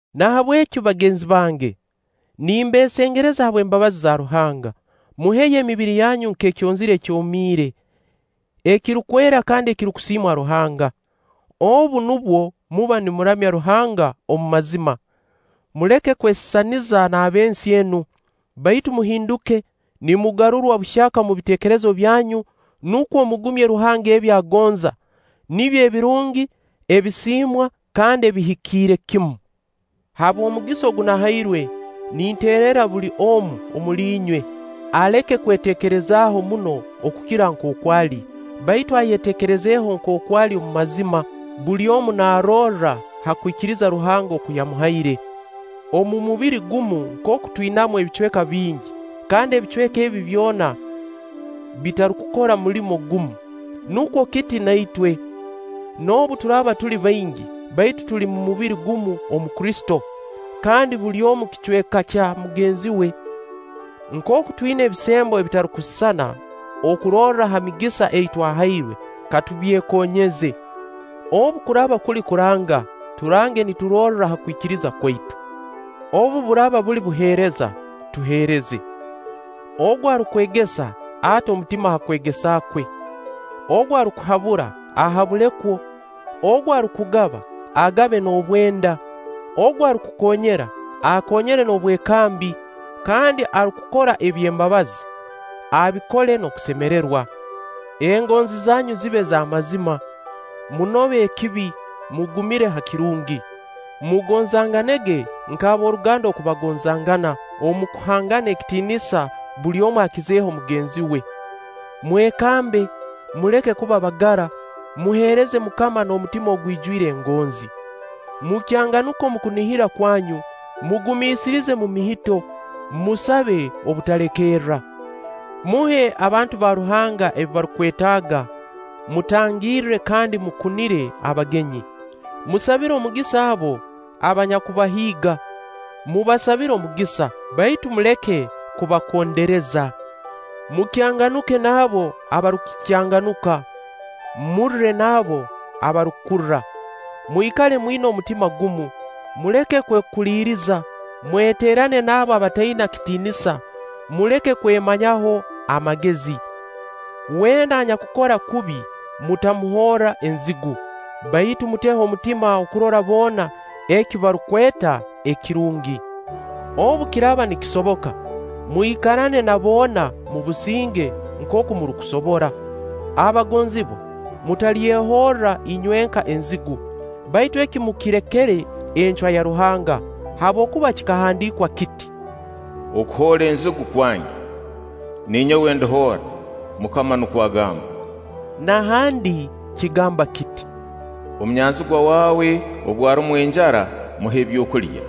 Nahabweki bagenzi bange, nimbeesengereza habw'embabazi za Ruhanga, muheyo emibiri yanyu nk'ekyonzira ekyomiire, ekirukwera kandi ekirukusiimwa Ruhanga. Obu nubwo muba nimuramya Ruhanga omu mazima. Muleke kwesisaniza n'ab'ensi enu, baitu muhinduke, nimugarurwa buhyaka omu biteekerezo byanyu, nukwo mugumye Ruhanga ebi agonza: nibyo ebirungi, ebisiimwa, kandi ebihikiire kimu. Habw'omugisa ogu nahairwe, ninteererra buli omu omuli inywe, aleke kweteekerezaaho muno okukira nkooku ali, baitu ayeteekerezeho nkooku ali omu mazima, buli omu naarorra ha kwikiriza Ruhanga oku yamuhaire. Omu mubiri gumu nkooku twinamu ebicweka bingi, kandi ebicweka ebi byona bitarukukora mulimo gumu, nukwo kiti na itwe. Noobu turaaba tuli baingi, baitu tuli mubiri gumu omu Kristo; kandi buli omu kicweka kya mugenzi we. Nkooku twina ebisembo ebitarukusisana okurorra ha migisa ei twahairwe, katubyekonyeze. Obu kuraaba kuli kuranga, turange niturorra ha kwikiriza kwaitu. Obu buraaba buli buheereza, tuheereze. Ogu arukwegesa, ate omutima ha kwegesa kwe. Ogu arukuhabura, ahabule kwo; ogu arukugaba, agabe n'obwenda; ogu arukukoonyera, akoonyere n'obwekambi; kandi arukukora eby'embabazi, abikole n'okusemererwa. Engonzi zanyu zibe z'amazima. Munobe ekibi, mugumire ha kirungi. Mugonzangane nk'ab'oruganda oku bagonzangana; omu kuhangana ekitiinisa buli omu akizeho mugenzi we. Mwekambe, muleke kuba bagara, muheereze MUKAMA n'omutima ogwijwire engonzi. Mukyanganuke omu kunihira kwanyu, mugumiisirize omu mihito, musabe obutalekerra. Muhe abantu ba Ruhanga ebi barukwetaaga, mutangirre kandi mukunire abagenyi. Musabire omugisa abo abanyakubahiiga; mubasabire omugisa, baitu muleke kubakondereza. Mukyanganuke n'abo abarukukyanganuka, murre n'abo abarukurra. Mwikale mwina omutima gumu; muleke kwekuliriza, mweteerane n'abo abataina kitiinisa, muleke kwemanyaho amagezi. Weena anyakukora kubi, mutamuhoora nzigu, baitu muteho omutima okukora boona eki barukweta ekirungi. Obu kiraaba nikisoboka, mwikarane na boona mu businge nkooku murukusobora. Abagonzibwa, mutalyehorra inywenka enzigu, baitu eki mukirekere encwa ya Ruhanga; habwokuba kikahandiikwa kiti: “Okuhoora enzigu kwange, ninyowe ndihoora; MUKAMA nukwo agamba.” Na handi kigamba kiti: “Omunyanzigwa waawe obu arumwa enjara, muhe ebyokulya;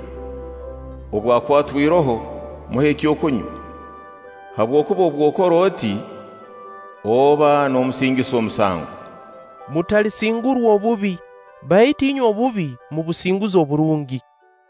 obu akwatwa iroho, muhe ekyokunywa; habwokuba obu okora oti, oba noomusingisa omusango.” Mutalisingurwa obubi, baitu inywe obubi mubusinguze oburungi.